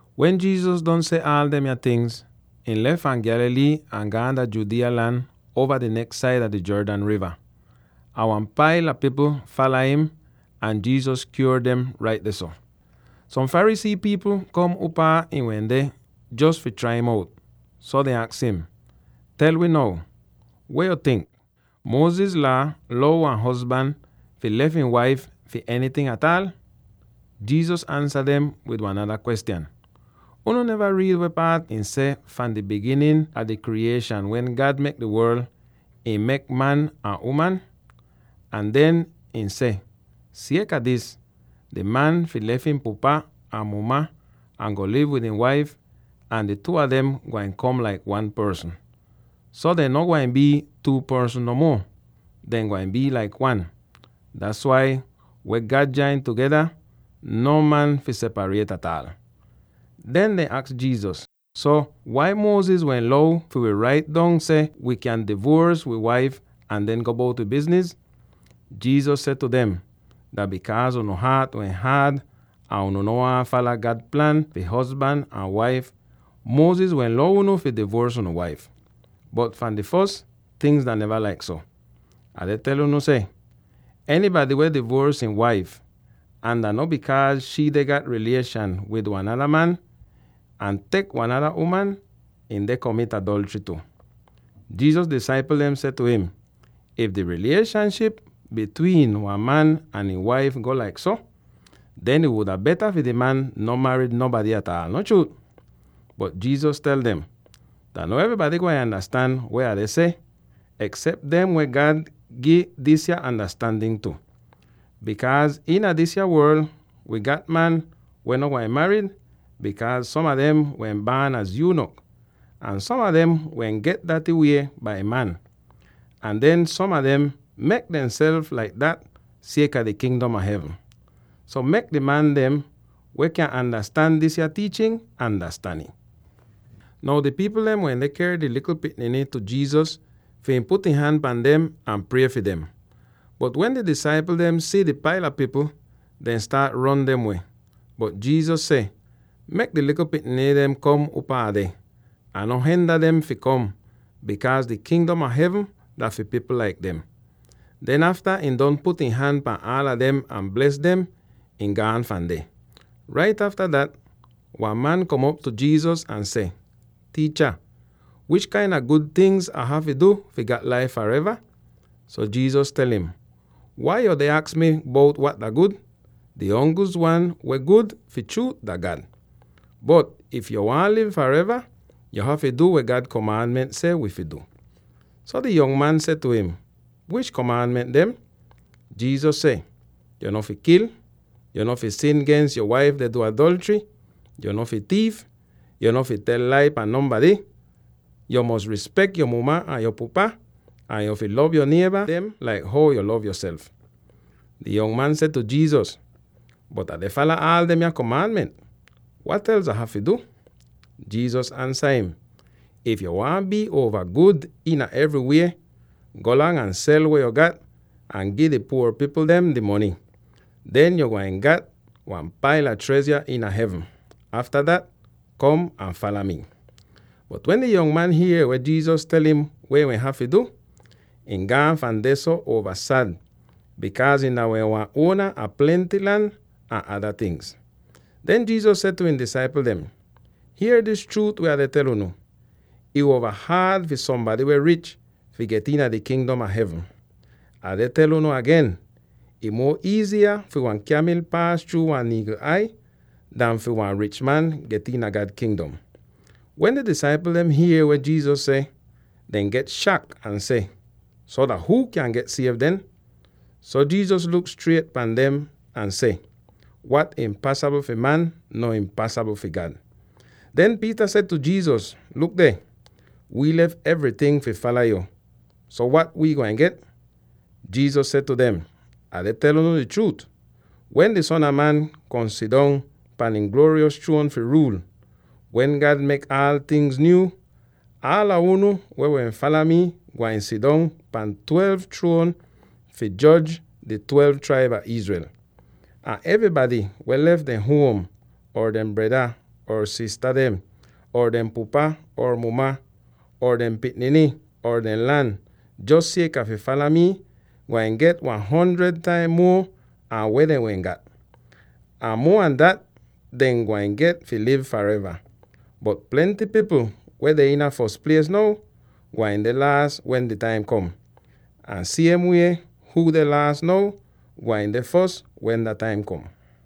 Wen Jesus don seh aal demya tingz, ihn lef fahn Galilee ahn gaan dah Judea lan uova di neks saida di Jordan riva. Ahn wan paila pipl fala im, ahn Jesus kyuor dem rait dehso. Som Pharisee pipl kom upaa ihn wende jos fi trai im out. So dehn aks im, “Tel wi now: Weh yo tink? Moses Laa lou wan hozban fi lef ihn waif fi enyting ataal?” Jesus ansa dem wid wan nada kwestyan, “Unu neva riid weh ih seh fahn di biginin a di kriyieshan wen God mek di worl, ihn mek man ahn uman.” Ahn den ihn seh, “Sieka dis, di man fi lef ihn pupa ahn ihn muma, ahn go liv wid ihn waif, ahn di two a dem gwain kom laik one porsn. So dehn no gwain bii two porsn no muo; dehn gwain bii laik one. Das wai, weh God jain tugeda, non man fi separiet ataal.” Den dehn aks Jesus, “So, wai Moses wehn lou wi fi rait dong seh wi kyan divuors wi waif ahn den go bout wi bizniz?” Jesus seh tu dem, “Dah bikaaz unu haat wehn haad ahn unu no waahn fala God plan fi hozban ahn waif, Moses wehn lou unu fi divuors unu waif. Bot fahn di fos, tingz dah neva laik so. Ah deh tel unu seh: enybady weh divuors ihn waif —ahn dah no bikaaz shii deh gat rilieshan wid wan nada man— ahn tek wan nada uman, ihn deh komit adolchry tu.” Jesus disaipl dem seh tu im, “If di rilieshanship bitwiin wan man ahn ihn waif go laik so, den ih wuda beta fi di man no marid nonbady ataal, no chruut?” Bot Jesus tel dem, “Dah no evrybady gwain andastan weh Ah deh seh, eksep dem weh God gi disya andastandin tu. Bikaaz iina disya worl wi gat man weh no gwain marid, bikaaz som a dem wehn baan az yunok, ahn som a dem wehn get daty wie bai man, ahn den som a dem mek demself laik dat sieka di Kingdom a Hevn. So, mek di man dem weh kyan andastan disya tiichin, andastan ih!” Now di pipl dem wende ker dehn likl pikniny tu Jesus fi ihn put ihn han pahn dem ahn prie fi dem. Bot wen di disaipl dehn si di paila pipl, dehn staat ron dem weh. Bot Jesus seh, “Mek di likl pikniny dehn kom upaa Ah deh, ahn no henda dem fi kom, bikaaz di Kingdom a Hevn dah fi pipl laik dem.” Den afta ihn don put ihn han pahn aala dem ahn bles dem, ihn gaan fahn deh. Rait afta dat wan man kom op tu Jesus ahn seh, “Tiicha, wish kain a gud tingz Ah hafy du fi gat laif fareva?” So Jesus tel im, “Wai yuu deh aks mi bout wat dah gud? Di ongli'is wan weh gud fi chruut dah God. Bot if yo waahn liv fareva, yo hafy du weh God komaanment seh wi fi du.” So di yong man seh tu im, “Wish komaanment dem?” Jesus seh, “Yo no fi kil, yo no fi sin gens yo waif deh du adolchry, yo no fi tiif, yo no fi tel lai pan nonbady, yo fi rispek yo muma ahn yo pupa, ahn yo fi lov yo nieba dem laik how yo lov yoself.” Di yong man seh tu Jesus, “Bot Ah deh fala aal demya komaanment. Wat els Ah hafy du?” Jesus ansa im, “If yo waahn bii uova gud iina evrywie, golang ahn sel weh yo gat ahn gi di puor pipl dem di mony; den yo gwain get wan paila trezha iina hevn. Afta dat, kom ahn fala mi.” Bot wen di yong man hier weh Jesus tel im weh ihn hafy du, ihn gaan fahn dehso uova sad, bikaaz ihn dah wehn wan uona a plenty lan ahn ada tingz. Den Jesus seh tu ihn disaipl dem, “Hier dis chruut weh Ah deh tel unu: ih uova haad fi sombady weh rich fi get iina di Kingdom a Hevn. Ah deh tel unu agen, ih muo iiziya fi wan kyamil paas chruu wan niigl ai, an fi wan rich man get iina God Kingdom.” Wen di disaipl dem hier weh Jesus seh, dehn get shak ahn seh, “So, dah huu kyan get siev den?” So Jesus luk striet pahn dem ahn seh, “Wat impasabl fi man, no impasabl fi God.” Den Peter seh tu Jesus, “Luk deh, wi lef evryting fi fala yo. So wat wii gwain get?” Jesus seh tu dem, “Ah deh tel unu di chruut: wen di Son a Man kom sidong pahn ihn gluoryos chruon fi ruul, wen God mek aal tingz nyuu, aala unu weh wehn fala mi gwain sidong pahn twelve chruon fi joj di twelve traib a Israel. Ahn evrybady weh lef dehn huom, or dehn breda or sista dem, or dehn pupa or muma, or dehn pikniny, or dehn lan jos sieka fi fala mii gwain get wan hundred taim muo an weh dehn wehn gat; ahn muo an dat, dehn gwain get fi liv fareva. Bot plenty pipl weh deh iina fos plies now, gwain deh laas wen dah taim kom; ahn siem wie, huu deh laas now, gwain deh fos wen dah taim kom.